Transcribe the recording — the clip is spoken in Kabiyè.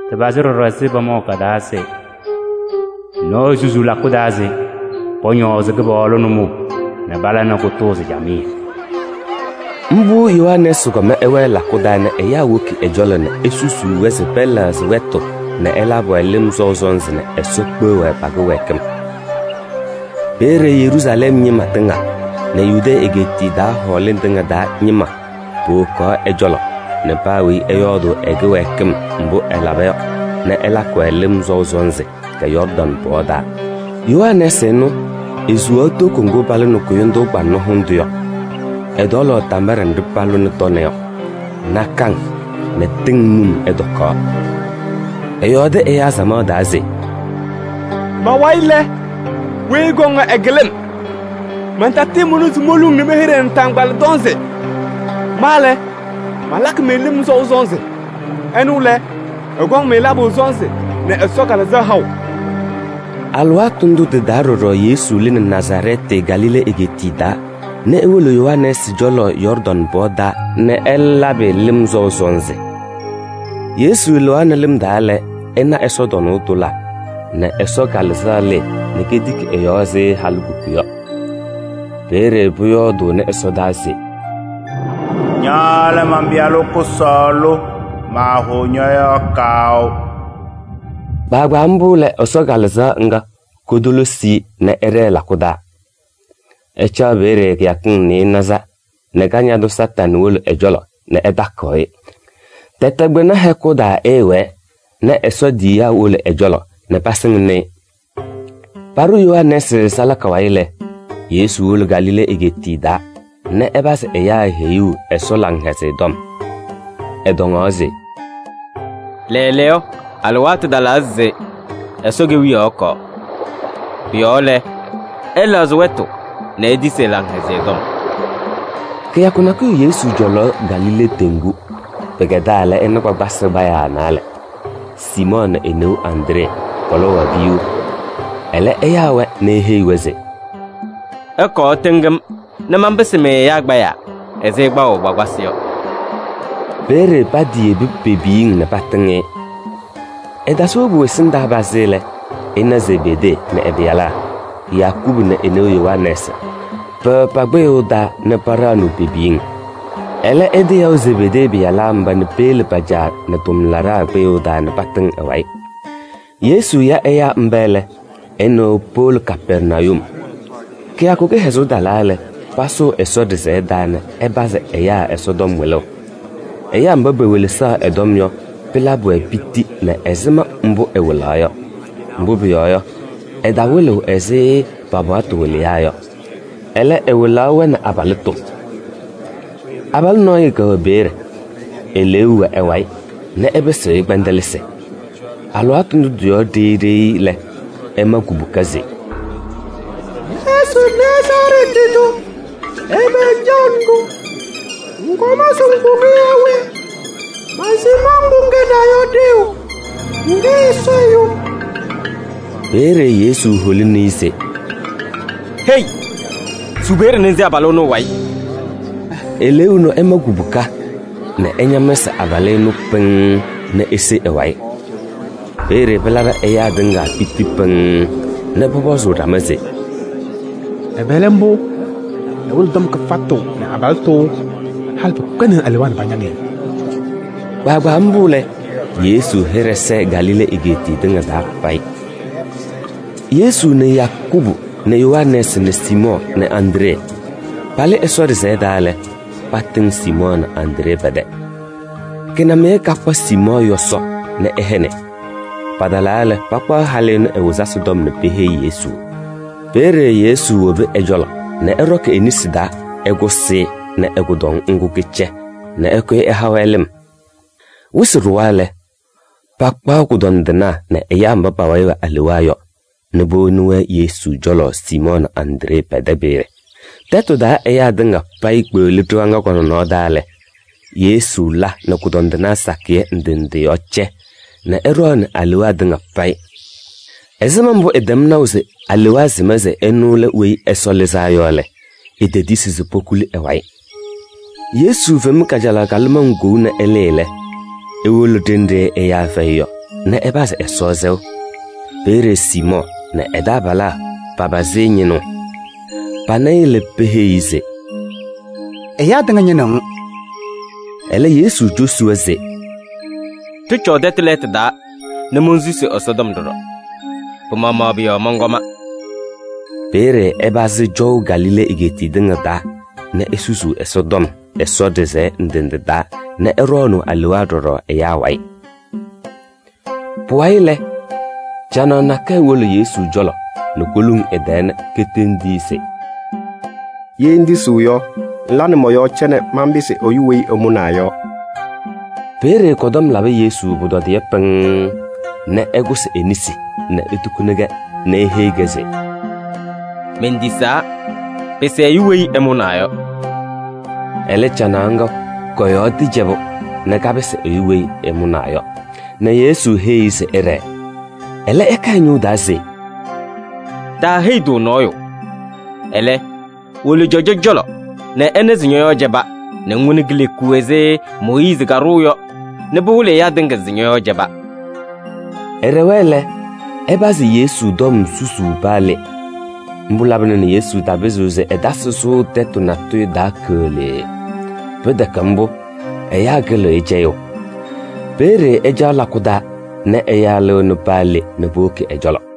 Tɩpazɩ ɖɔɖɔ ɛzɩ pamaʋ ka-taa se: “Nɔɔyʋ susuu lakʋ taa se pɔñɔɔzɩ Kɩpaɣlʋ nʋmɔʋ nɛ pala nɛ kʋtʋʋzɩ camɩyɛ” yɔ. Mbʋ Yohanɛɛsɩ kɔm ɛwɛɛ lakʋ taa nɛ ɛyaa woki ɛ-cɔlɔ nɛ esusuu-wɛ se pɛlɛɣzɩ wɛtʋ nɛ ɛlabɩ-wɛ lɩm sɔʋ sɔnzɩ nɛ Ɛsɔ kpeɣ-wɛ pa-kɩwɛɛkɩm. Peeye Yeruusalɛm ñɩma tɩŋa nɛ Yudee egeetiye taa hɔɔlɩŋ tɩŋa taa ñɩma powokaɣ ɛ-cɔlɔ nɛ paa weyi ɛyɔɔdʋʋ ɛ-kɩwɛɛkɩm mbʋ ɛlaba yɔ nɛ ɛlakɩ-wɛ lɩm sɔʋ sɔnzɩ Yɔɔrdaŋ pɔɔ taa. Yohanɛɛsɩ ɛnʋ, esuwaɣ toko ŋgʋ palʋnɩ kʋyʋndʋʋ kpaŋnɔ hʋndʋ yɔ. Ɛtɔɔlaɣ tambaɖɛ nɖɩ palabɩnɩ tɔnɛ yɔ, nakaŋ nɛ tɩŋ num ɛtɔkaɣ. Ɛyɔɔdɩ ɛyaa samaɣ taa se: “Ma-wayɩ lɛ, weyi ɛkɔŋ yɔ, ɛkɩlɩ-m. Mantatɩɩmʋna se moluŋ nɛ mɛyɛɖɩ ɛ-naataŋgbala tɔnzɩ. Ma lɛ, malakɩ-mɩ lɩm sɔʋ sɔnzɩ, ɛnʋ lɛ, ɛkɔŋ-mɩ labʋ sɔnzɩ nɛ Ɛsɔ Kalɩzaɣ haʋ.” Alɩwaatʋ ndʋ tɩ-taa ɖɔɖɔ Yesu lɩnɩ Nazarɛɛtɩ, Galilee egeetiye taa nɛ ewolo Yohanɛɛsɩ cɔlɔ Yɔɔrdaŋ pɔɔ taa nɛ ɛlɛ labɩ-ɩ lɩm sɔʋ sɔnzɩ. Yesu lɩɣaɣnɩ lɩm taa lɛ, ɛna ɛsɔtɔnʋʋ tʋlaa nɛ Ɛsɔ Kalɩzaɣ lɩɩ nɛ ketiki ɛ-yɔɔ ɛzɩ halikuku yɔ. Peeye pʋyɔɔdʋʋnɩ ɛsɔdaa se: “Ña lɛ man-Pɩyalʋ kʋsɔɔlʋ, maahʋʋ ñɔ-yɔɔ kaʋ.” Kpaagbaa mbʋ lɛ, Ɛsɔ Kalɩzaɣ ŋga kotolisi-i nɛ ɛɖɛɛ lakʋ taa. Ɛcaɣ peeye kɩyakɩŋ nɩɩnaza nɛ Kañadʋ Satanɩ wolo ɛ-cɔlɔ nɛ ɛtakɩɣ-ɩ. Tɛtɛ kpɩna hɛkʋ taa ɛɛwɛɛ nɛ Ɛsɔ tiyiyaa wolo ɛ-cɔlɔ nɛ pasɩŋnɩ-ɩ. Paɖʋ Yohanɛɛsɩ salaka wayɩ lɛ, Yesu wolo Galilee egeetiye taa nɛ ɛpazɩ ɛyaa heyuu Ɛsɔ Laŋhɛzɩyɛ Tɔm. Ɛtɔŋaɣ se: “Lɛɛlɛɛyɔ, alɩwaatʋ talaa se Ɛsɔ Kewiyaɣ ɛkɔɔ. Pʋ-yɔɔ lɛ, ɩlɛɣzɩ wɛtʋ nɛ itisi ɛ-Laŋhɛzɩyɛ Tɔm.” Kɩyakʋ nakʋyʋ Yesu cɔlaɣ Galilee teŋgu. Pɩkɛdaa lɛ, ɛna kpakpasɩ kpayaa naalɛ: Siimɔɔ nɛ e-neu Andree, pɔlɔwaɣ piyuu. Ɛlɛ ɛyaa-wɛ nɛ eheyi-wɛ se: “Ɩkɔɔ ɩtɩŋ-m nɛ manpɩsɩ-mɩ ɛyaa kpayaa ɛzɩ ɩkpaɣʋ kpakpasɩ yɔ.” Peeye patiyebi pe-piyiŋ nɛ patɩŋ-ɩ. Ɛtasɩ wobu ɛsɩndaa pazɩ lɛ, ɛna Zebedee nɛ ɛ-pɩyalaa: Yakubu nɛ e-neu Yohanɛɛsɩ, pɛwɛ pa-kpɩyʋʋ taa nɛ paɖaɣnɩɣ pe-piyiŋ. Ɛlɛ, ɛtɩyaʋ Zebedee pɩyalaa mba nɛ peyele pa-caa nɛ tʋmlaɖaa kpɩyʋʋ taa nɛ patɩŋ ɛ-wayɩ. Yesu ya ɛyaa mba lɛ, ɛ nɛ wɛ powolo Kapɛrnayum. Kɩyakʋ kɩhɛzʋʋ talaa lɛ, pasʋʋ Ɛsɔ ɖɩsɛyɛ taa nɛ ɛpazɩ ɛyaa Ɛsɔtɔm wɩlʋʋ. Ɛyaa mba pewelesaɣ ɛ-tɔm yɔ, pɩlabɩ-wɛ piti nɛ ɛzɩma mbʋ ɛwɩlaɣ yɔ. Mbʋ pʋyɔɔ yɔ, ɛtawɩlɩɣ-wɛ ɛzɩ pa-paɣtʋ wɩlɩyaa yɔ. Ɛlɛ, ɛwɩlaɣ-wɛ nɛ abalɩtʋ. Abalʋ nɔɔyʋ kɛwɛ peeye, eleeu wɛ ɛ-wayɩ nɛ ɛpɩsɩɣ-ɩ kpɛndɛlɩsɩ. Alɩwaatʋ ndʋ tɩ-yɔɔ ɖeyi ɖeyi lɛ, ɛma kubuka se: “Yesu Nazarɛɛtɩ tʋ, ɛbɛ ŋcaɣnɩ-ɖʋ? Ŋkɔm se ŋkʋ-ɖʋ yaa we? Mansɩm mbʋ ŋkɛnaa yɔ ɖeu, ŋkɛ Ɛsɔ Ɛyʋ.” Peeye Yesu holini-i se: “Hei! Su peeye nɛ ŋse abalʋ ɛnʋ ɛ-wayɩ.” Eleeu ɛnʋ ɛma kubuka nɛ ɛñamsɩ abalʋ ɛnʋ pɩŋŋ nɛ ese ɛ-wayɩ. Peeye pɩlabɩ ɛyaa tɩŋa piti pɩŋŋ nɛ pɔpɔzʋʋ ɖama se: “Ɛbɛ lɛ mbʋ? Ɛwɩlɩɣ tɔm kɩfatʋ nɛ abalɩtʋ! Halɩ pɩkpɛndɩnɩ alewaa nɛ pañaŋ-ɩ.” Kpaagbaa mbʋ lɛ, Yesu hɩɖɛ sɛɛ Galilee egeetiye tɩŋa payɩ. Yesu nɛ Yakubu nɛ Yohanɛɛsɩ nɛ Siimɔɔ nɛ Andree palɩ Ɛsɔ ɖɩsɛyɛ taa lɛ, patɩŋ Siimɔɔ nɛ Andree pɛ-tɛ. Kɩnamɩyɛ kakpa Siimɔɔ yɔsɔ nɛ ɛhɛnɩ. Patalaa lɛ, pakpaɣ halʋ ɛnʋ ɛ-wɩzasɩ tɔm nɛ peheyi Yesu. Peeye Yesu wobi ɛ-cɔlɔ nɛ ɛɖɔkɩ e-nesi taa ɛkʋsɩ-ɩ nɛ ɛ-kʋdɔŋ ŋgʋ kɩcɛ nɛ ɛkʋyɩ ɛha-wɛ lɩm. Wɩsɩ ɖʋwa lɛ, pakpaɣ kʋdɔndɩnaa nɛ ɛyaa mba pa-wayɩ wɛ alewaa yɔ nɛ powoni-wɛ Yesu cɔlɔ Siimɔɔ nɛ Andree pɛ-tɛ peeye. Tɛtʋ taa ɛyaa tɩŋa payɩ kpeɣli ɖɩɣa ŋga kɔ-nɔnɔɔ taa lɛ, Yesu la nɛ kʋdɔndɩnaa sakɩyɛ ndɩ ndɩ yɔɔ cɛ nɛ ɛɖɔɔnɩ alewaa tɩŋa payɩ. Ɛzɩma mbʋ ɛtɛm naʋ se alewaa sɩma se ɛnʋ lɛ Weyi Ɛsɔ Lɩzaa Yɔ lɛ, etetisi se pokuli ɛ-wayɩ. Yesu fem kajalaɣ kalɩmaŋ kou nɛ ɛlɩɩ lɛ, ewolo ɖenɖe ɛyaa fɛyɩ yɔ nɛ ɛpazɩ Ɛsɔ sɛʋ. Peeye Siimɔɔ nɛ ɛ-taabalaa papazɩ-ɩ ñɩnʋʋ. Pana-ɩ lɛ, peheyi-i se: “Ɛyaa tɩŋa ñɩnɩɣ-ŋ.” Ɛlɛ, Yesu cosi-wɛ se: “Ɖɩcɔɔ tɛtʋ lɛɛtʋ taa nɛ monsusi Ɛsɔtɔm ɖɔɖɔ. Pɩ-maɣmaɣ pʋ-yɔɔ mɔnkɔma.” Peeye ɛpazɩ cɔʋ Galilee egeetiye tɩŋa taa nɛ esusuu Ɛsɔtɔm Ɛsɔ ɖɩsɛyɛ ndɩ ndɩ taa nɛ ɛɖɔɔnʋʋ alewaa ɖɔɖɔ ɛyaa wayɩ. Pʋwayɩ lɛ, canaɣ nakɛyɛ wolo Yesu cɔlɔ nɛ koluŋ ɛ-tɛɛ nɛ ketendi-i se: “Ye ŋtisiɣ yɔ, ŋla nɛ mɔ-yɔɔ cɛ nɛ manpɩsɩ ɛyʋ weyi ɛmʋnaa yɔ.” Peeye kɔ-tɔm labɩ Yesu pʋtɔdɩyɛ pɩŋŋ nɛ ɛkʋsɩ e-nesi nɛ etukuni-kɛ nɛ eheyi-kɛ se: “Mentisaa, pɩsɩ ɛyʋ weyi ɛmʋnaa yɔ.” Ɛlɛ, canaɣ ŋga kɔ-yɔɔ tɩcɛbʋ nɛ kapɩsɩ ɛyʋ weyi ɛmʋnaa yɔ nɛ Yesu heyi-i se ɛɖɛɛ. Ɛlɛ ɛka ɛ-ñʋʋ taa se: “Taaheyi-tʋ nɔɔyʋ. Ɛlɛ, wolo cɔjɔ cɔlɔ nɛ ɛna se ñɔ-yɔɔ cɛba, nɛ ŋwoni kileku ɛzɩ Mooyiizi kadʋʋ yɔ nɛ pɩwɩlɩ ɛyaa tɩŋa se ñɔ-yɔɔ cɛba.” Ɛɖɛwa lɛ, ɛpazɩ Yesu tɔm susuu paa le. Mbʋ labɩna nɛ Yesu tapɩzɩɣ se ɛtasɩ sʋʋ tɛtʋ natʋyʋ taa keɣlee. Pɩtɛkɛ mbʋ, ɛyaa kɩlɩɣ-ɩ cɛyʋʋ. Peeye ɛcaɣ lakʋ taa nɛ ɛyaa lɩɣnɩ paa le nɛ powoki ɛ-cɔlɔ.